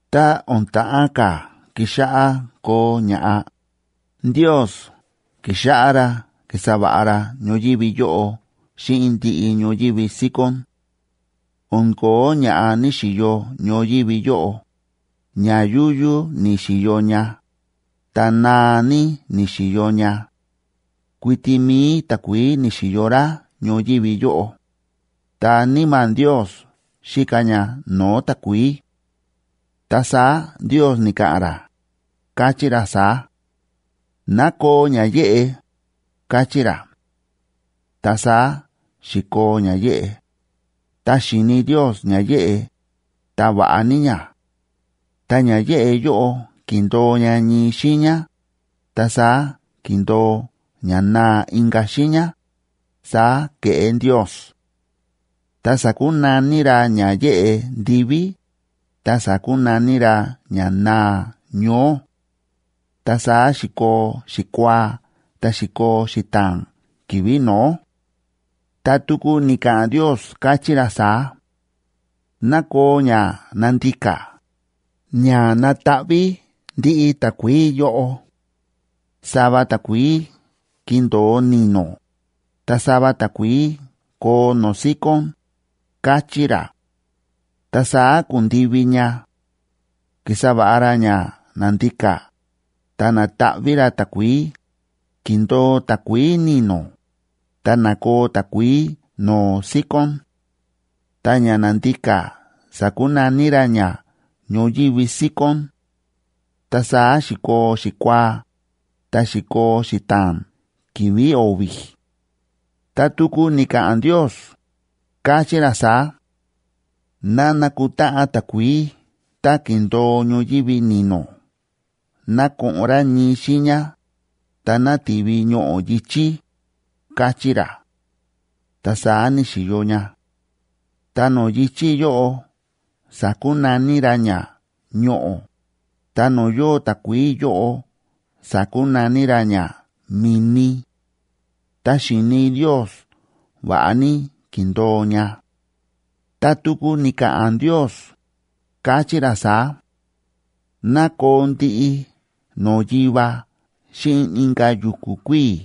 Tá o̱n ta̱ꞌán ka̱ kixáꞌá koo ña̱ꞌa, Ndios ki̱xáꞌá ra ki̱sa va̱ꞌa ra ñoyívi yóꞌo xíꞌin ndiꞌi ñoyívi síkón. O̱n ko̱ó ña̱ꞌa ní‑xiyo ñoyívi yóꞌo, ña yúyú ni̱xi̱yo ña, ta naa ní ni̱xi̱yo ña. Kuiti mi̱i takuií ni̱xi̱yo rá ñoyívi yóꞌo. Ta Níma̱ Ndios xíka ña no̱o̱ takuií. Ta saá Ndios ni̱ka̱ꞌa̱n ra, káchí ra saá: “Ná koo ña yéꞌe”, káchí ra. Ta saá xi̱koo ña yéꞌe. Ta xi̱ni Ndios ña yéꞌe, ta va̱ꞌa ní ña. Ta ña yéꞌe yóꞌo ki̱ndo̱o ña ñii xiiña, ta saá ki̱ndo̱o ñanaa inka̱ xiiña, saá ke̱ꞌé Ndios. Ta sa̱kunaní ra ña yéꞌe “ndiví”, ta sa̱kunaní ra ñanaa “ñoó”. Ta saá xi̱koo xikuaa, ta xi̱koo xita̱a̱n ki̱vi̱ no̱ó. Ta tuku ni̱ka̱ꞌa̱n Ndios, káchí ra saá: “Ná koo ña nandika, ña nataꞌví ndiꞌi takuií yóꞌo. Sava takuií kindo̱o ni̱no̱, ta sava takuií koo no̱o̱ síkón”, káchí ra. Ta saá ku̱ndivi ña. Ki̱sa va̱ꞌa ra ña na̱ndika, ta na̱taꞌví ra takuií, ki̱ndo̱o takuií ni̱no̱, ta na̱koo takuií no̱o̱ síkón. Ta ña na̱ndika sa̱kunaní ra ña “ñoyívi síkón”. Ta saá xi̱koo xikuaa, ta xi̱koo xita̱a̱n ki̱vi̱ o̱vi̱. Ta tuku ni̱ka̱ꞌa̱n Ndios, káchí ra saá: “Ná nakutáꞌan takuií tá ki̱ndo̱o ñoyívi ni̱no̱ ná ko̱ꞌo̱n rá ñii xiiña, ta ná ti̱vi ñoꞌo̱ yi̱chí”, káchí ra. Ta saá ni̱xi̱yo ña. Ta no̱o̱ yi̱chí yóꞌo sa̱kunaní ra ña “ñoꞌo̱”, ta no̱o̱ yóo takuií yóꞌo sa̱kunaní ra ña “mi̱ni”. Ta xi̱ni Ndios va̱ꞌa ní ki̱ndo̱o ña. Ta tuku ni̱ka̱ꞌa̱n Ndios, káchí ra saá: “Ná koo ndiꞌi no̱o̱ yiva xíꞌin inka̱ yu̱ku̱ kuíi̱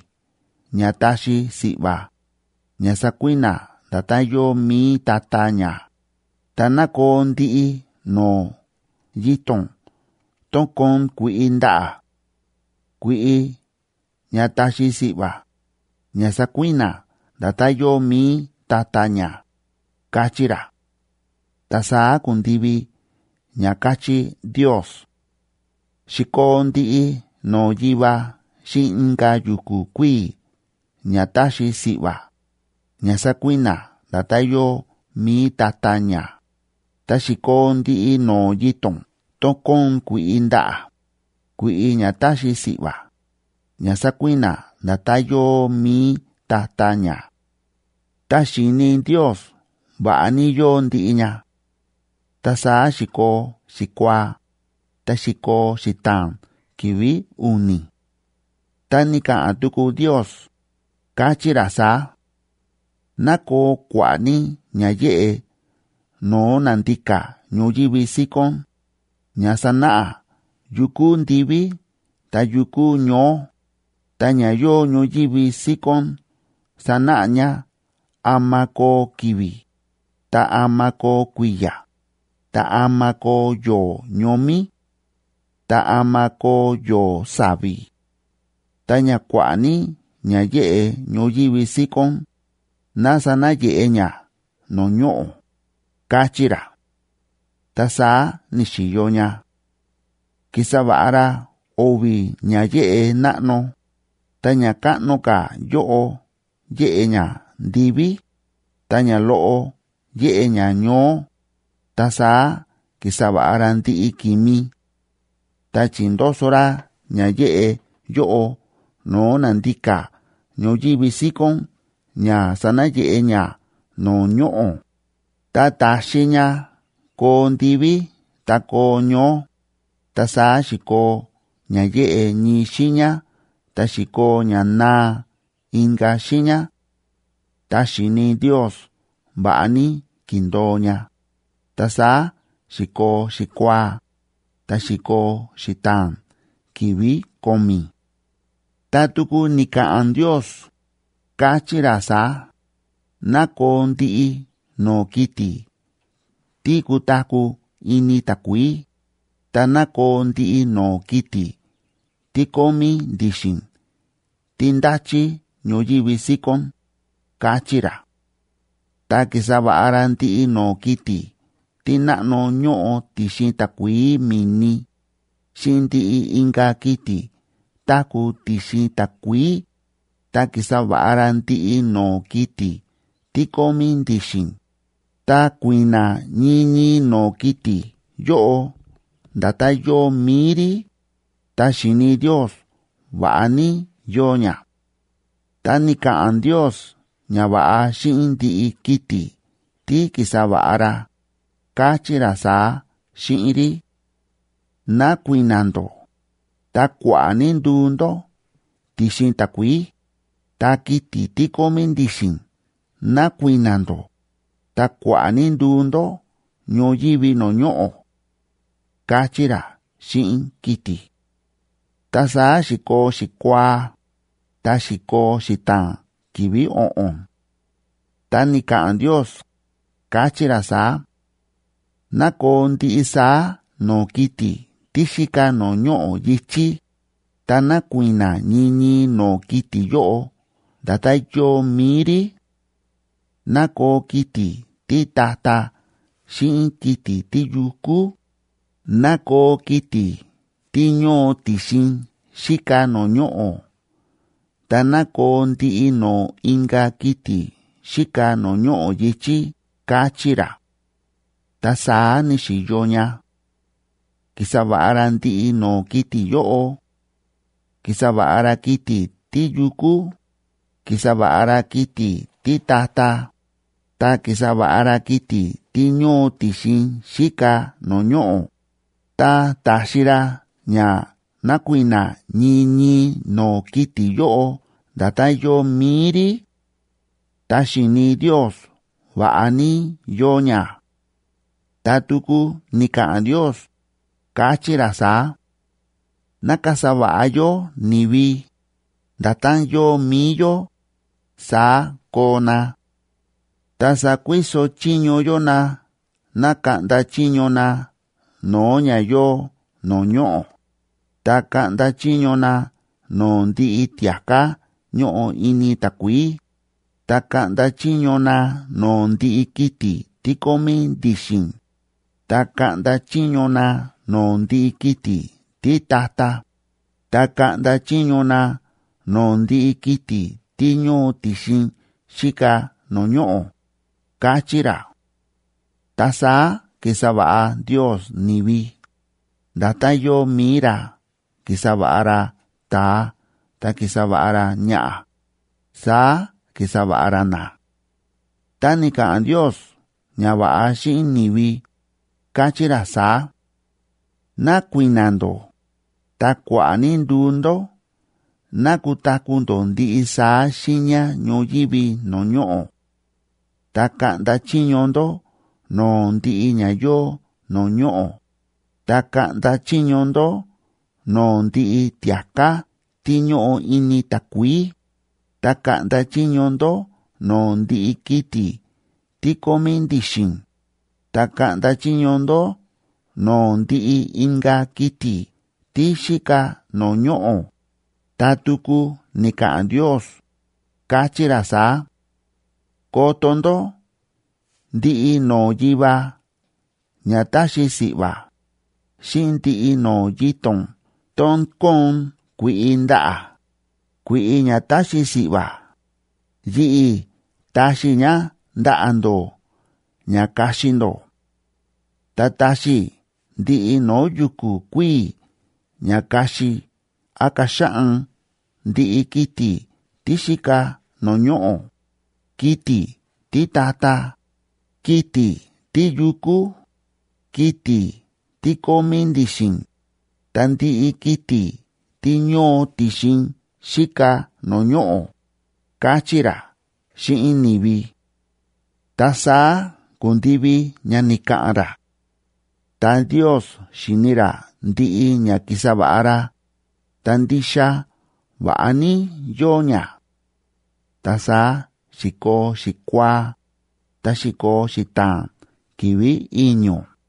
ña táxi si̱ꞌva̱, ña sakui̱na̱ nda̱tán yóo mi̱i ta̱ta̱ ña, ta ná koo ndiꞌi no̱o̱ yito̱n tón kóon kui̱ꞌi ndaꞌa̱, kui̱ꞌi ña táxi si̱ꞌva̱, ña sakui̱na̱ nda̱tán yóo mi̱i ta̱ta̱ ña”, káchí ra. Ta saá ku̱ndivi ña ka̱chí Ndios. Xi̱koo ndiꞌi no̱o̱ yiva xíꞌin inka̱ yu̱ku̱ kuíi̱ ña táxi si̱ꞌva̱, ña sákui̱na̱ nda̱tán yóo mi̱i ta̱ta̱ ña, ta xi̱koo ndiꞌi no̱o̱ yito̱n tón kóon kui̱ꞌi ndaꞌa̱, kui̱ꞌi ña táxi si̱ꞌva̱, ña sákui̱na̱ nda̱tán yóo mi̱i ta̱ta̱ ña. Ta xi̱ni Ndios va̱ꞌa ní yóo ndiꞌi ña. Ta saá xi̱koo xikuaa, ta xi̱koo xita̱a̱n ki̱vi̱ u̱ni̱. Ta ni̱ka̱ꞌa̱n tuku Ndios, káchí ra saá: “Ná koo kua̱ꞌa̱ ní ña yéꞌe no̱o̱ na̱ndika ñoyívi síkón, ña sanáꞌa yu kúu ndiví ta yu kúu ñoó, ta ña yóo ñoyívi síkón sanáꞌa ña ama koo ki̱vi̱, ta ama koo kui̱ya̱, ta ama koo yo̱o̱ ñomí, ta ama koo yo̱o̱ sa̱vi̱. Ta ña kua̱ꞌa̱ ní ña yéꞌe ñoyívi síkón, ná sanayeꞌe ña no̱o̱ ñoꞌo̱”, káchí ra. Ta saá ni̱xi̱yo ña. Ki̱sa va̱ꞌa ra o̱vi̱ ña yéꞌe náꞌno, ta ña káꞌno ka̱ yóꞌo yéꞌe ña ndiví, ta ña loꞌo yéꞌe ña ñoó, ta saá ki̱sa va̱ꞌa ra ndiꞌi ki̱mi. Ta chi̱ndoso ra ña yéꞌe yóꞌo no̱o̱ na̱ndika ñoyívi síkón ña sanayeꞌe ña no̱o̱ ñoꞌo̱, ta ta̱xi ña koo ndiví ta koo ñoó, ta saá xi̱koo ña yéꞌe ñii xiiña ta xi̱koo ñanaa inka̱ xiiña. Ta xi̱ni Ndios va̱ꞌa ní ki̱ndo̱o ña. Ta saá xi̱koo xikuaa, ta xi̱koo xita̱a̱n ki̱vi̱ ko̱mi̱. Ta tuku ni̱ka̱ꞌa̱n Ndios, káchí ra saá: “Ná koo ndiꞌi no̱o̱ kiti̱ tí kutaku̱ ini takuií, ta ná koo ndiꞌi no̱o̱ kiti̱ tí kómí ndi̱xi̱n tí ndachí ñoyívi síkón”, káchí ra. Ta ki̱sa va̱ꞌa ra ndiꞌi no̱o̱ kiti̱ tí náꞌno ñóꞌo ti̱xin takuií mi̱ni, xíꞌin ndiꞌi inka̱ kiti̱ táku̱ ti̱xin takuií, ta ki̱sa va̱ꞌa ra ndiꞌi no̱o̱ kiti̱ tí kómí ndi̱xi̱n, ta kui̱na̱ ñii ñii no̱o̱ kiti̱ yóꞌo nda̱tán yóo mi̱i rí. Ta xi̱ni Ndios va̱ꞌa ní yóo ña. Ta ni̱ka̱ꞌa̱n Ndios ñava̱ꞌa xíꞌin ndiꞌi kiti̱ tí ki̱sa va̱ꞌa ra, káchí ra saá xíꞌin rí: “Ná kui̱na̱ ndó, ta kua̱ꞌa̱ ní nduu ndó ti̱xin takuií, ta kiti̱ tí kómí ndi̱xi̱n ná kui̱na̱ ndó, ta kua̱ꞌa̱ ní nduu ndó ñoyívi no̱o̱ ñoꞌo̱”, káchí ra xíꞌin kiti̱. Ta saá xi̱koo xikuaa, ta xi̱koo xita̱a̱n ki̱vi̱ o̱ꞌo̱n. Ta ni̱ka̱ꞌa̱n Ndios, káchí ra saá: “Ná koo ndiꞌi saá no̱o̱ kiti̱ tí xíka no̱o̱ ñoꞌo̱ yi̱chí, ta ná kui̱na̱ ñii ñii no̱o̱ kiti̱ yóꞌo nda̱tán yóo mi̱i rí: ná koo kiti̱ títa̱ta̱ xíꞌin kiti̱ tíyukú, ná koo kiti̱ tí ñóo ti̱xin xíka no̱o̱ ñoꞌo̱, ta ná koo ndiꞌi no̱o̱ inka̱ kiti̱ xíka no̱o̱ ñoꞌo̱ yi̱chí”, káchí ra. Ta saá ni̱xi̱yo ña. Ki̱sa va̱ꞌa ra ndiꞌi no̱o̱ kiti̱ yóꞌo. Ki̱sa va̱ꞌa ra kiti̱ tíyukú, ki̱sa va̱ꞌa ra kiti̱ títa̱ta̱, ta ki̱sa va̱ꞌa ra kiti̱ tí ñóo ti̱xin xíka no̱o̱ ñoꞌo̱, ta ta̱xi ra ña nakui̱na̱ ñii ñii no̱o̱ kiti̱ yóꞌo nda̱tán yóo mi̱i rí. Ta xi̱ni Ndios va̱ꞌa ní yóo ña. Ta tuku ni̱ka̱ꞌa̱n Ndios, káchí ra saá: “Ná kasa va̱ꞌa yó ni̱vi, nda̱tán yóo mi̱i yó, saá koo na. Ta sakuiso chiño yó na ná kaꞌnda chiño na no̱o̱ ña yóo no̱o̱ ñoꞌo̱, ta kaꞌnda chiño na no̱o̱ ndiꞌi tia̱ká ñóꞌo ini takuií, ta kaꞌnda chiño na no̱o̱ ndiꞌi kiti̱ tí kómí ndi̱xi̱n, ta kaꞌnda chiño na no̱o̱ ndiꞌi kiti̱ títa̱ta̱, ta kaꞌnda chiño na no̱o̱ ndiꞌi kiti̱ tí ñóo ti̱xin xíka no̱o̱ ñoꞌo̱”, káchí ra. Ta saá ki̱sa va̱ꞌa Ndios ni̱vi, nda̱tán yóo mi̱i ra; ki̱sa va̱ꞌa ra ta̱a ta ki̱sa va̱ꞌa ra ñaꞌa̱, saá ki̱sa va̱ꞌa ra na. Ta ni̱ka̱ꞌa̱n Ndios ñava̱ꞌa xíꞌin ni̱vi, káchí ra saá: “Ná kui̱na̱ ndó, ta kua̱ꞌa̱ ní nduu ndó ná kutaku̱ ndó ndiꞌi saá xiiña ñoyívi no̱o̱ ñoꞌo̱. Ta kaꞌnda chiño ndó no̱o̱ ndiꞌi ña yóo no̱o̱ ñoꞌo̱, ta kaꞌnda chiño ndó no̱o̱ ndiꞌi tia̱ká tí ñóꞌo ini takuií, ta kaꞌnda chiño ndó no̱o̱ ndiꞌi kiti̱ tí kómí ndi̱xi̱n, ta kaꞌnda chiño ndó no̱o̱ ndiꞌi inka̱ kiti̱ tí xíka no̱o̱ ñoꞌo̱.” Ta tuku ni̱ka̱ꞌa̱n Ndios, káchí ra saá: “Koto ndó, ndiꞌi no̱o̱ yiva ña táxi si̱ꞌva̱, xíꞌin ndiꞌi no̱o̱ yito̱n tón kóon kui̱ꞌi ndaꞌa̱, kui̱ꞌi ña táxi si̱ꞌva̱, yi̱ꞌi̱ táxi i̱ ña ndaꞌa̱ ndó ña kaxi ndó. Ta táxi i̱ ndiꞌi no̱o̱ yu̱ku̱ kuíi̱ ña kaxi án kaxaꞌan ndiꞌi kiti̱ tí xíka no̱o̱ ñoꞌo̱, kiti̱ títa̱ta̱, kiti̱ tíyukú, kiti̱ tí kómí ndi̱xi̱n, ta ndiꞌi kiti̱ tí ñóo ti̱xin xíka no̱o̱ ñoꞌo̱”, káchí ra xíꞌin ni̱vi. Ta saá ku̱ndivi ña ni̱ka̱ꞌa̱n ra. Ta Ndios xi̱ni ra ndiꞌi ña ki̱sa va̱ꞌa ra, ta ndixa va̱ꞌa ní yóo ña. Ta saá xi̱koo xikuaa, ta xi̱koo xita̱a̱n ki̱vi̱ i̱ño̱.